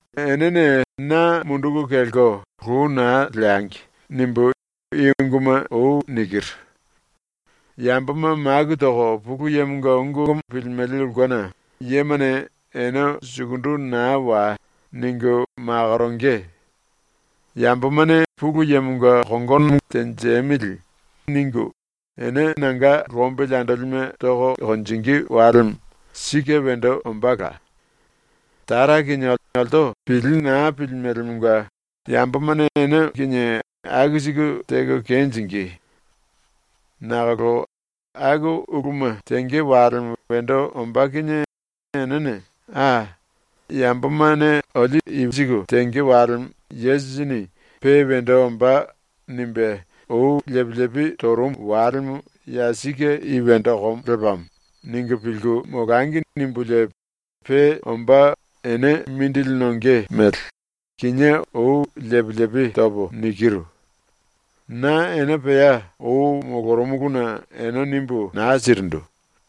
“‘Enene na munduku kelko lou naa leangi.’ nimbu i unguma nikiru. Yamboma maku toko Pulu Yemonga ungu pilimele ulkena yemane ene “Sukundu naa wai!” ningu makoronge. Yambomane ‘Pulu Yemonga kongono tenjemili.’ ningu ene nanga lombili andolime toko konjingí walemo sike wendo ombála. Tara kinie olto pili naa pilimelemonga yambomane ene kinie aku siku teko kenjingí. “Nakolo ‘Aku uluma tenge walemo wendo ombá kinie enene ‘A, yambomane olio i siku tenge walemo Yesusini pe wendo ombá nimbe lepi lepi torumu walemo ya sike i wendo okomo lepamo.’ ningu pilku molangi.’ nimbulie pe ombá ene mindili nonge mele, kinié ou lepi lepi topo nikiru. Na ene pea ou molorumuluna ene nimbu naa sirindu.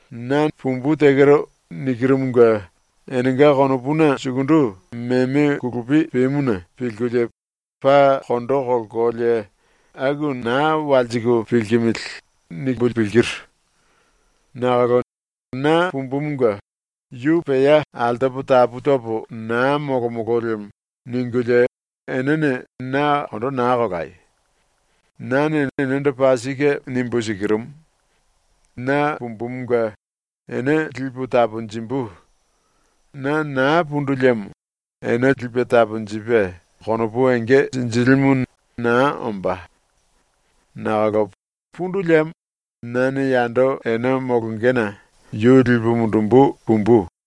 ‘Nane “Pumbu tekero.” nikirumunge enenga konopuna sukundu meme kulupi pemuna pilkulie paa kondo kolkolie aku naa walsiku pilkimili.’ nimbu pilkiru. Nakolo na pumbumunge ‘Yu pea altopo tapu topo naa molomolo lemo.’ ningulie enene na kondo naa kolayo. Nane enendo paa sike nimbu sikirumu: na pumbumunge ene lipu taponjimbu. Na naa pundu liemo ene Lipe Taponjipe Konopu Enge Sinjilimu naa ombá. Nakolo pundu liemo nane yando ene molongena yu lipu mundumbu pumbu.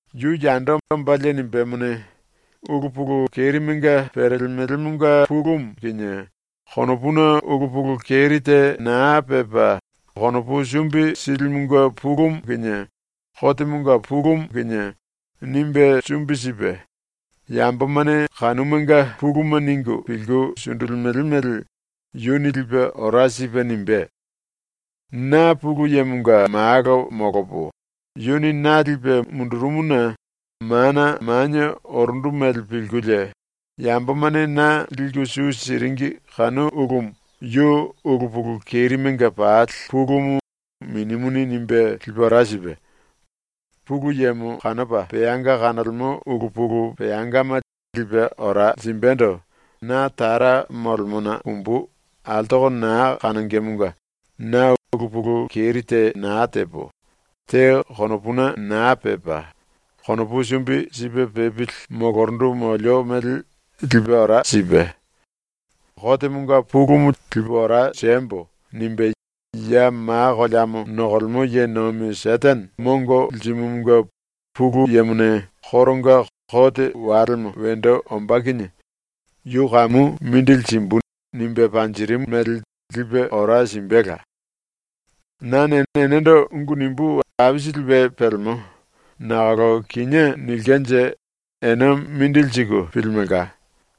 “Yu yando ombalie nimbémone, ulu pulu kerimenga perelemelemonga pulumu kinie konopuna ulu pulu keri te naa pepa konopu sumbi silimunge pulumu kinie kotemonga pulumu kinie nimbe sumbi sipe, yambomane kanumanga puluma ningu pilku sundulimele mele yuni lipe ora sipe nimbé. Na Pulu Yemonga Malo molopo, yuni na lipe mundurumuna mana manie orundu mele pilkulie yambomane na liku su siringi kanu ulumu yu ulu pulu kerimenga pali pulumu Minimuni nimbe lipe ora sipe; Pulu Yemo kanopa peanga kanolemo ulu pulu peangama lipe ora simbendo na Tara molemona pumbu altoko naa kanongemonga na ulu pulu keri te naa tepo, te konopuna naa pepa konopu sumbi sipe pepili molorundu molio mele lipe ora sipe; ‘Kotemonga pulumu lipu ora siembo.’ nimbe ya ma koleamo nokolemo ye nomi ⸤Setene⸥ mongo lirimumunge Pulu Yemone koronga ‘Kote walemo wendo ombá kinie yu kamu mindili simbu.’ nimbe panjirimu mele lipe ora simbela. “Nane enendo ungu nimbú aisili we pelemo, nakolo kinié nilkenje ene mindili siku pilimelka.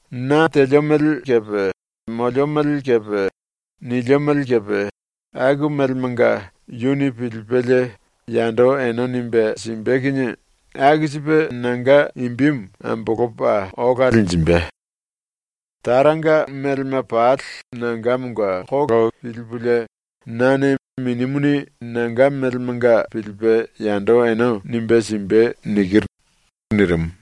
Na telio mele kepe molio mele kepe nilio mele kepe aku melemanga yuni pilipelie yando ene nimbe simbe kinie aku sipe nanga imbimu ambolopa ola linjimbe. Taranga melema pali nangamonga pilipulie nane ‘Minimuni nanga melemanga pilipe yando ene nimbe simbe.’ nikiru.” ⸤nirimu.⸥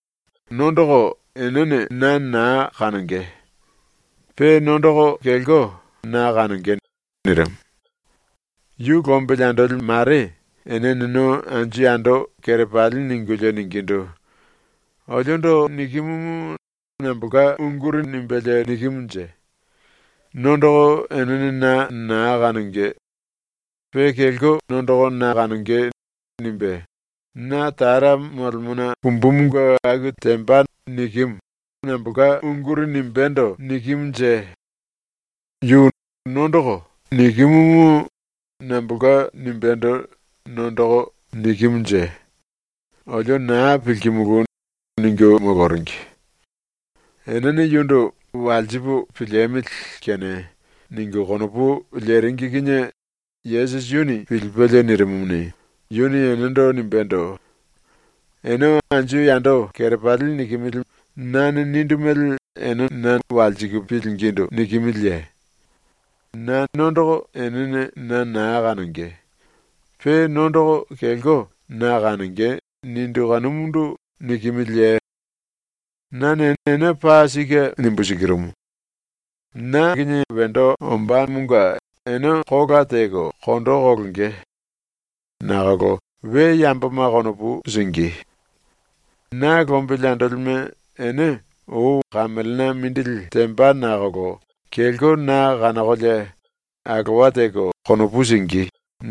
“Nondoko enene na naa kanonge. Pe nondoko kelko na kanonge.” nirimu. Yu lombili andoli mare ene eneno anju yando kerepali ningulie ningindu: “Oliondo nikimumu nambolka unguri nimbelie nikimunje? “Nondoko enene na naa kanonge. Pe kelko nondoko na kanonge.” nimbe, “Na Tara molemona pumbumunge aku temba.” nikimu, nambolka unguri nimbendo nikimunje? Yu “nondoko” nikimumu nambolka nimbendo “nondoko” nikimunje? Olio naa pilkimulu.” ningu moloringi. Enene yundu ‘Walsipu piliemili kene.’ ningu konopu leringi kinie Yesusi yuni pilipelie nirimumuni, yuni enendo nimbendo: “Ene anju yando kerepali nikimili nane nindu mele ene na walsiku pilingindu nikimiliye? Nane “Nondoko enene na naa kanonge. Pe nondoko kelko na kanonge.” nindu kanumundu nikimiliye? Nane ene paa sike nimbu sikirumu: Na tembomonga ene kola teko kondo kolonge. Nakolo we yamboma konopu singí. Na lombili andolime ene ou kamelena mindili temba nakolo kelko na kanokolie alowa teko konopu singí.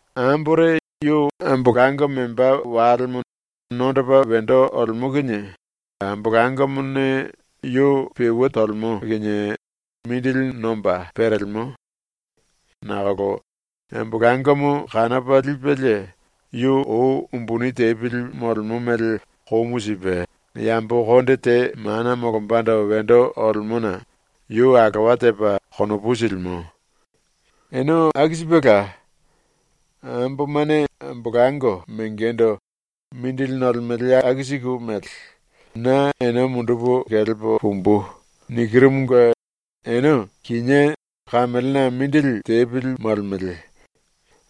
“Ambore yu ambolango membá walemo nondopa wendo olemo kinie ambolangomone yu peue tolemo kinie mindili nomba perelemo. Nakolo ambolangomo kanopa lipelie yu ou umbuni tepili molemo mele komu sipe yambo konde te mana molombando wendo olemona yu alowa tepa konopu silimo. Ene aku sipela. Ambomane ambolango mengendo mindili nolemele aku siku mele “Na ene mundupu kelepo pumbu.” nikirumunge ene kinié kamelena mindili tepili molemele.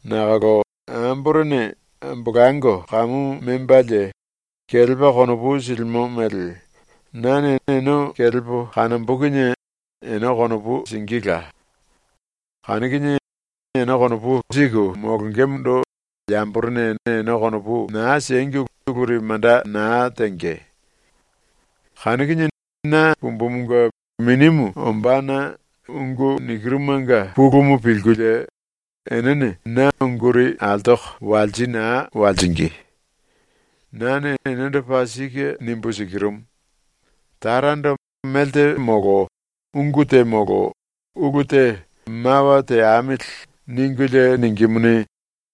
Nakolo amborene ambolango kamu membalie kelepa konopu silimo mele nane ene kelepo kanombo kinie ene konopu singíla. Kanu kinie ene konopu siku molongemondo yamborene ene konopu naa siengi uluri manda naa tenge. “Kanu kinie na pumbumunge Minimu ombána ungu nikirumanga pulumu pilkulie enene na unguri altoko walsi naa walsingí. Nane enendo paa sike nimbu sikirumu: Tarando melte molo ungu te molo ulu te ‘Mawa teamili.’ ningulie ningímuni,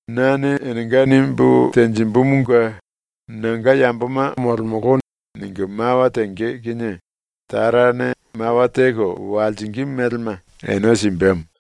nane enenga nimbu tenjimbumunge ‘Nanga yamboma molemolo.’ ningu mawa tenge kinie Tarane mawa teko walsingí melema ene simbemo.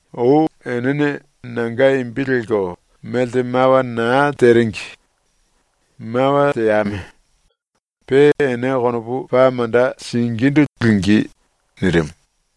Ou enene nanga imbi lelko melte mawa naa teringi. Mawa teame. Pe ene konopu paa manda singíndu lingí.” ⸤nirimu.⸥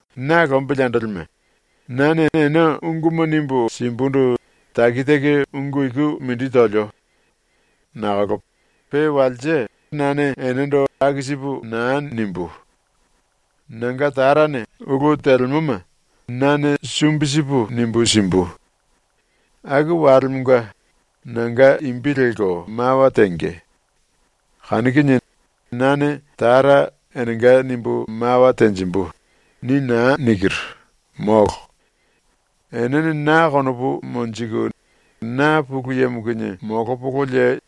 “Na lombili andolime, nane ene unguma nimbu simbundu taki taki ungu iku mindi tolio. Nakolo pe walse nane enendo aku sipu naa nimbú. Nanga Tarane ulu telemoma nane sumbi sipu nimbu simbu. Aku walemonga nanga imbi lelko mawa tenge. Kanu kinie ‘Nane Tara enenga nimbu mawa tenjimbu.’ ni naa nikiru, molo. Enene na konopu monjiku, na Pulu Yemo kinie molopololie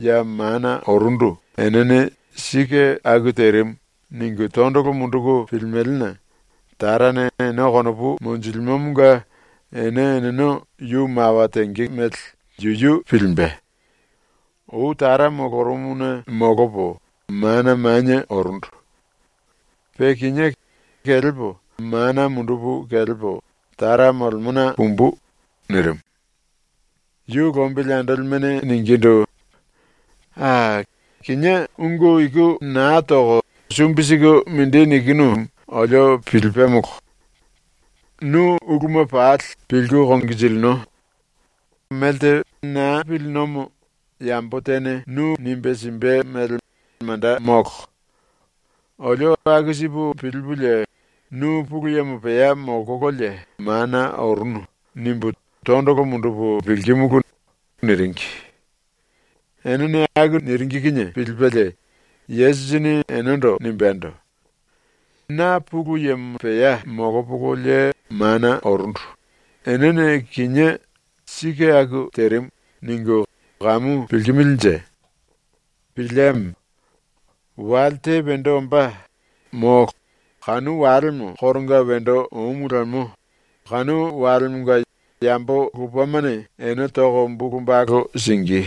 ya mana orundu enene ‘Sike aku terimu.’ ningu tondolo munduku pilimelena Tarane ene konopu monjilimomonga ene eneno yu mawa tenge mele yuyu pilimbe. Ou Tara molorumuna molopo mana manie orundu. Pe kinié kelepo mana mundupu kelepo Tara molemona pumbu.” nirimu. Yu lombili andolimene ningindu: “A, kinié ungu iku naa toko sumbi siku mindi nikinu olio pilipemolo. Nu uluma pali pilku konginjilino. Mele naa pilinomo yambo tene nimbe simbe mele manda molo. Olio aku sipu pilipulie ‘Nu Pulu Yemo pea molkololie mana orunu.’ nimbu tondolo mundupu pilkimulu.” niringi. Enene aku niringi kinie pilipelie Yesusini enendo nimbendo: “Na Pulu Yemo pea molopololie mana orundu enene kinié ‘Sike aku terimu.’ ningu kamu pilkimilinje? Pilieme. Wale te wendo ombá, molo, kanu walemo koronga wendo omu lemo, kanu walemonga yambo lupemane ene toko bulu balu singí.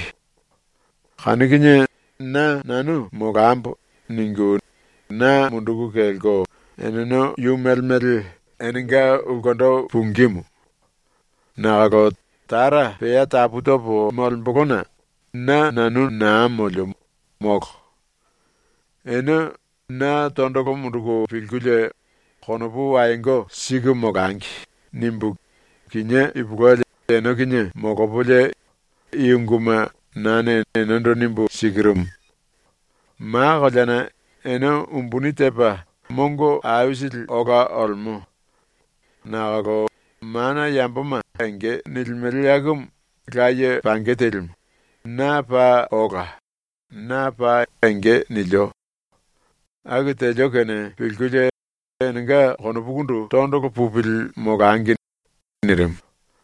Kanu kinie ‘Na nanu molambo.’ ningu na munduku kelko eneno yu mele mele enenga ulkendo pungímu. Nakolo Tara pea tapu topo molembolona na nanu naa molio, molo. “Ene ‘Na tondolo munduku pilkulie konopu wayongo siku molangi.’ nimbu kinié ipulueli ene kinie molopolie i unguma nane enendo nimbu sikirumu. Ma koleana ene umbuni tepa mongo aisili ola olemo. Nakolo mana yamboma enge nilimele akumu laye pange telimu, na paa ola, na paa enge nilio. Aku telio kene pilkulie enenga konopukundu tondolo pupili molangi.” nirimu.